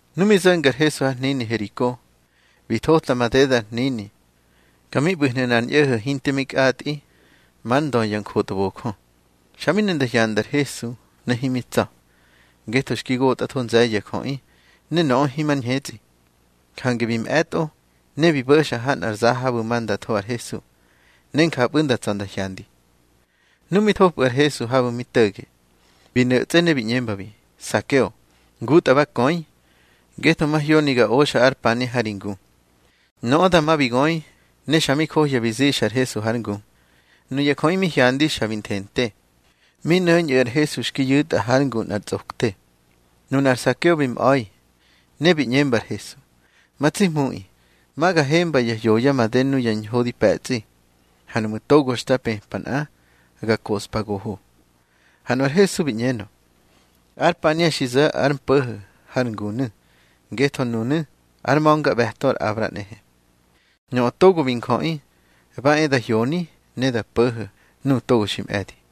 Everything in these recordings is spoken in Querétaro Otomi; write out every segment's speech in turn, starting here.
Nu mi zo̱nga ar Hesu har hnini Heriko, bi thota madeda ar hnini. Ka mi ꞌbu̱hnu̱ nꞌar ñꞌo̱ho̱ hinte mi kꞌatꞌi, már ndö ya njotbojö. Xa mi ne nda hyanda ar Hesu, ne himi tsa̱, ngetho xki gotꞌatho nze̱ye̱ ya jöꞌi, ne nöꞌö himar ñhetsꞌi. Jange bi mꞌe̱tꞌo, ne bi bo̱xa ha nꞌar za habu̱ ma nda tho ar Hesu, ne njapꞌu̱ nda tsa̱ nda hyandi. Nu mi thopꞌu̱ ar Hesu habu̱ mi to̱ge, bi no̱tsꞌe ne bi ꞌñembabi: —Sakeo, ngutꞌa ba köi, ngetho mahyoni ga oxa ar pania ha ri ngu. Nöꞌö dama bi göi, ne xa mi johya bi zixa ar Hesu hár ngu. Nuya jöꞌi mi hyandi xa bi nthente, mi nöñꞌu̱ ar Hesu xki yu̱tꞌa hár ngu nꞌar tsꞌokte. Nunar Sakeo bi mꞌa̱i, ne bi ꞌñemba ar Hesu: —Ma tsi Hmuꞌi, ma ga hemba ya hyoya made nuya ñho di pe̱tsꞌi, ha nuꞌmu̱ togo xta pëpa nꞌa, ga koꞌspa goho. Ha nu ar Hesu bi ꞌñenö: —Ár pania xi zo̱ ar mpo̱ho̱ har ngunu̱, ngetho nunu̱ ár ma̱ngaꞌbe̱to ar Abra nꞌehe. Nöꞌö Togo bi Njöꞌi, ba e da hyoni ne da po̱ho̱ nuꞌu̱ togo xi mꞌe̱di.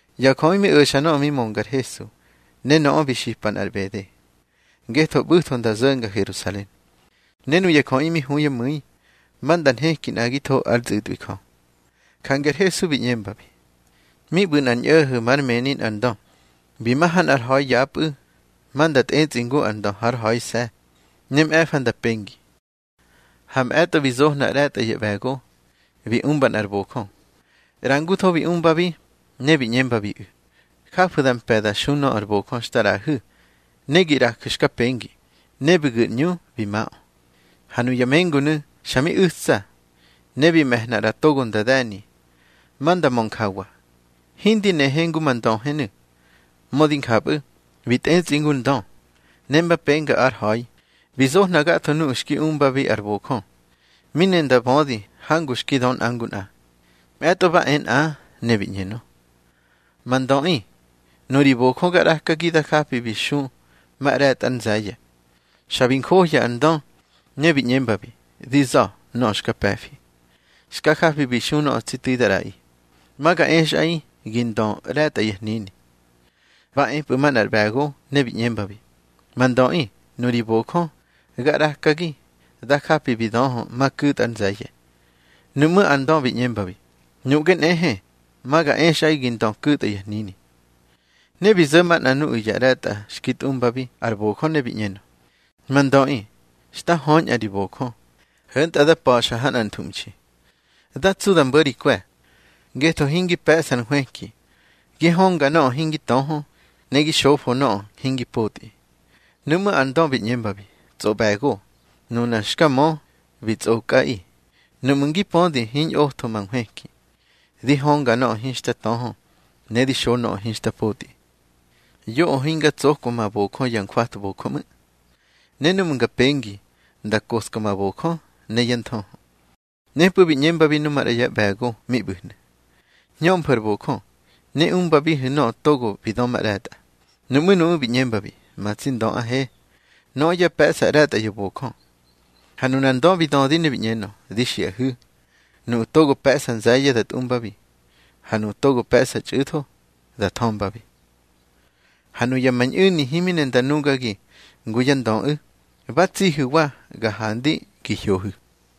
Ya jöꞌi mi o̱xa nöꞌö mi mönga ar Hesu. Ne nöꞌö bi xipa nꞌar ꞌbede, ngetho ꞌbu̱tho nda zo̱nga Herusalen, ne nuya jöꞌi mi hu yá mu̱i ma nda nheki nꞌagitho ár tsꞌu̱tꞌwi Jö. Jange ar Hesu bi ꞌñembabi: —Mi ꞌbu̱ nꞌar ñꞌo̱ho̱ már mëni nꞌar ndö. Bi ma ha nꞌar ha̱i yapꞌu̱, ma nda tꞌetsꞌi ngu ar ndö hár ha̱ise̱, ne mꞌe̱fa nda pengi. Ha mꞌe̱tꞌo, bi zohna ꞌre̱tꞌa yá ꞌbe̱go, bi umba nꞌar bojö. ꞌRangutho bi umbabi, ne bi ꞌñembabiꞌu̱: Jafu̱ da mpe̱ da xu nöꞌö ar bojö xta ꞌraꞌahu̱, ne gi ꞌraju̱ xka pengi. Ne bi gu̱ ar ꞌñu bi maꞌö. Ha nuya mengunu̱ xa mi u̱tsa, ne bi me̱hna ꞌra togo nda de̱ni, ma nda mö njawa: Hindi nehe ngu ma ndöhenu̱. Mödi njapꞌu̱, bi tꞌetsꞌi ngu ar ndö. Ne mba penga ár ha̱i, bi zohna gatho nuꞌu̱ xki umbabi ar bojö, mi ne nda bödi hangu xki dö nꞌa ngu nꞌa. Mꞌe̱tꞌo ba e nꞌa, ne bi ꞌñenö: Ma ndöꞌi, nuri bojö ga ꞌrakagi, da japi bi xu ma ꞌre̱tꞌa ár nze̱ye̱. Xa bi njohya ar ndö, ne bi ꞌñembabi: Di za̱ nöꞌö xka pe̱fi. Xka japi bi xu nöꞌö tsi tu̱i da ꞌraꞌi. Ma ga exꞌaꞌi gi ndö ꞌre̱tꞌa ya hnini. Ba epꞌu̱ manꞌar ꞌbe̱go, ne bi ꞌñembabi: Ma ndöꞌi, nuri bojö ga ꞌrakagi, da japi bi döhö ma ku̱tꞌa ár nze̱ye̱. Nuꞌmú̱ ar ndö bi ꞌñembabi: Nuꞌge nꞌehe, ma ga exꞌaꞌi gi ndö ku̱tꞌa ya hnini. Ne bi zo̱ manꞌa nuꞌu̱ ya ꞌre̱tꞌa xki tꞌumbabi ar bojö, ne bi ꞌñenö: Ma ndöꞌi, xta höñꞌa ri bojö, ho̱ntꞌa da pa̱xa ha nꞌar nthuꞌmxi. Da tsu da mbo̱ ri kwe̱, ngetho hingi pe̱ꞌsa ar hwëki. Gi hönga nöꞌö hingi töhö, ne gi xofo nöꞌö hingi potꞌi. Nuꞌmú̱ ar ndö bi ꞌñembabi: Tsꞌoꞌbe̱go, nuna xka mö, bi tsꞌokꞌaꞌi. Nuꞌmu̱ ngi pödi hiñꞌotho ma nhwëki, di hönga nöꞌö hinxta töhö, ne di xo nöꞌö hinxta potꞌi, yoꞌö hinga tsokwa ma bojö ya njwatbojö ꞌmu̱, ne núꞌmu̱ nga pengi, nda njoska ma bojö ne yá nthöhö. Nepꞌu̱ bi ꞌñembabi nu maꞌra yá ꞌbe̱go mi ꞌbu̱hnu̱: Hñömfu̱ ar bojö, ne umbabihu̱ nöꞌö togo bi dö ma ꞌre̱tꞌa. Nuꞌmú̱ nuꞌu̱ bi ꞌñembabi: Ma tsi ndöꞌahe, nöꞌö ya pe̱ꞌsa ꞌre̱tꞌa ya bojö. Ha nunar ndö bi dödi ne bi ꞌñenö: Di xiꞌahu̱, nuꞌu̱ togo pe̱ꞌsa nze̱ye̱, da tꞌumbabi. Ha nuꞌu̱ togo pe̱ꞌsa txꞌu̱tho, da thömbabi. Ha nuya ma ñꞌu̱ni himi ne nda nugagi ngu yá ndöꞌu̱, ba tsihu̱wa ga handi gi hyohu̱.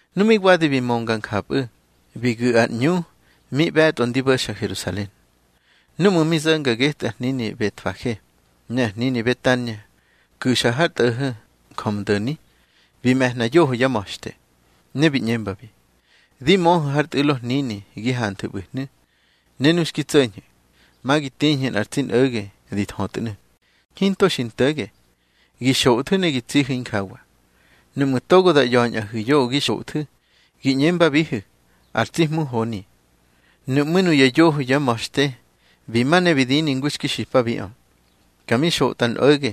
Nu mi wadi bi mönga njapꞌu̱, bi gu̱ ar ꞌñu mi ꞌbe̱tꞌo ndi bo̱xa Herusalen. Núꞌmu̱ mi zo̱nga getꞌu̱ ar hnini Betfage ne ar hnini Betania ku̱xa har tꞌo̱ho̱ Njömdo̱ni, bi me̱hna yoho yá ma̱xte, ne bi ꞌñembabi: —Di möhu̱ har tꞌu̱lo hnini gi hanthu̱ ꞌbu̱hnu̱, ne nu xki tso̱ñhu̱, ma gi tiñhu̱ nꞌar tsi nꞌo̱ge di thötnu̱, hinto xi nto̱ge. Gi xothu̱ ne gi tsihu̱ injawa. Nuꞌmu̱ togo da ꞌya̱ñꞌahu̱ yoꞌö gi xothu̱, gi ꞌñembabihu̱: Ar tsi Hmu honi. Nuꞌmú̱ nuya yoho yá ma̱xte bi ma ne bi dini ngu xki xipabiꞌö. Ka mi xotꞌa ar nꞌo̱ge,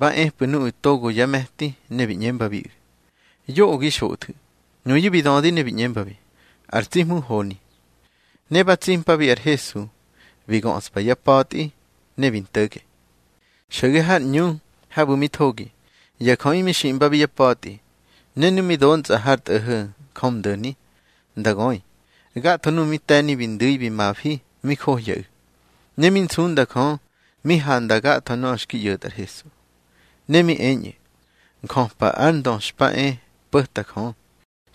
ba epꞌu̱ nuꞌu̱ togo yá me̱ti, ne bi ꞌñembabiꞌu̱: —Yoꞌö gi xothu̱. Nuyu̱ bi dödi ne bi ꞌñembabi: —Ar tsi Hmu honi. Ne ba tsimpabi ar Hesu, bi göꞌspa yá pa̱tꞌi, ne bi nto̱ge. Xo̱ge har ꞌñu habu̱ mi thogi, ya jöꞌi mi xiꞌmbabi yá pa̱tꞌi. Ne nu mi dontsꞌa har tꞌo̱ho̱ Njömdo̱ni nda göi, gatho nuꞌu̱ mi te̱ni bi ndu̱i bi mafi mi johyaꞌu̱. Ne mi nsunda Jö mi handa gatho nöꞌö xki ꞌyo̱tꞌa ar Hesu. Ne mi eñꞌu̱: —Njöpa ar Ndö xpa e po̱ta Jö.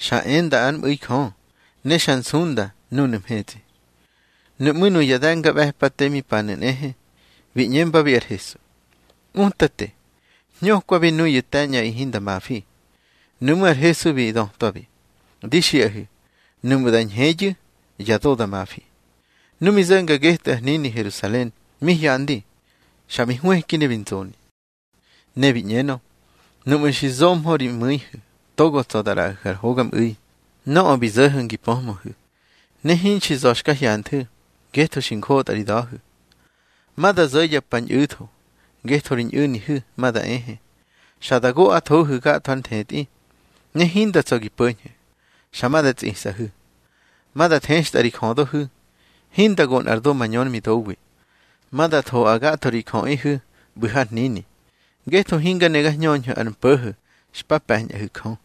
Xa enda ár mꞌu̱i Jö, ne xa nsunda núnu̱ mhetsꞌi. Nuꞌmú̱ nuya de̱ngaꞌbe̱pate mi panu̱ nꞌehe, bi ꞌñembabi ar Hesu: —Utate, hñökwabi nuyu̱ te̱ñꞌaꞌi hinda mafi. Nuꞌmú̱ ar Hesu bi dötwabi: —Di xiꞌahu̱, nuꞌmu̱ da ñheyu̱, ya do da mafi. Nu mi zo̱nga getꞌu̱ ar hnini Herusalen, mi hyandi, xa bi hwëki ne bi nzoni. Ne bi ꞌñenö: —Nuꞌmu̱ xi zohmö ri mu̱ihu̱ togo tsa̱ da ꞌraꞌahu̱ ar hogamꞌu̱i. Nöꞌö bi zo̱ho̱ ngi pöhmöhu̱, ne hinxi za̱ xka hyanthu̱, ngetho xi njotꞌa ri da̱hu̱. Ma da zo̱ ya pa ñꞌu̱tho, ngetho ri ñꞌu̱nihu̱ ma da ehe, xa da goꞌathohu̱ gatho ar nthetꞌi, ne hinda tsa̱ gi po̱ñhu̱, xa ma da tsisꞌahu̱. Ma da thextꞌa ri jödohu̱, hinda go nꞌar do mañör midowi. Ma da thoꞌa gatho ri jöꞌihu̱ ꞌbu̱ har hnini, ngetho hinga ne ga hñöñhu̱ ar mpo̱ho̱ xpa pe̱ñꞌahu̱ Jö.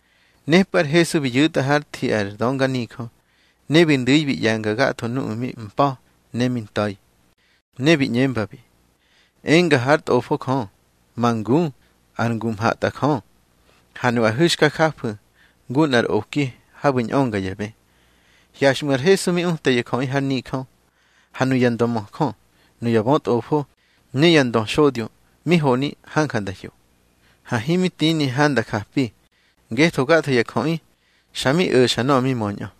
Nepꞌu̱ ar Hesu bi yu̱tꞌa hár thi ar dönganijö, ne bi ndu̱i bi ꞌye̱nga gatho nuꞌu̱ mi mpa̱ ne mi nta̱i. Ne bi ꞌñembabi: —Enga hár Tꞌofo Jö: Ma ngu, ar ngu mhatꞌajö. Ha nuꞌahu̱ xka jafu̱ ngu nꞌar oki habu̱ ñꞌönga ya bë. Hyaxꞌmu̱ ar Hesu mi uta ya jöꞌi har nijö. Ha nuya ndömöjö, nuya bötꞌofo, ne ya ndöxodyo, mi honi hanja nda hyo. Ha himi tini handa japi, ngetho gatho ya jöꞌi xa mi o̱xa nöꞌö mi möñꞌö.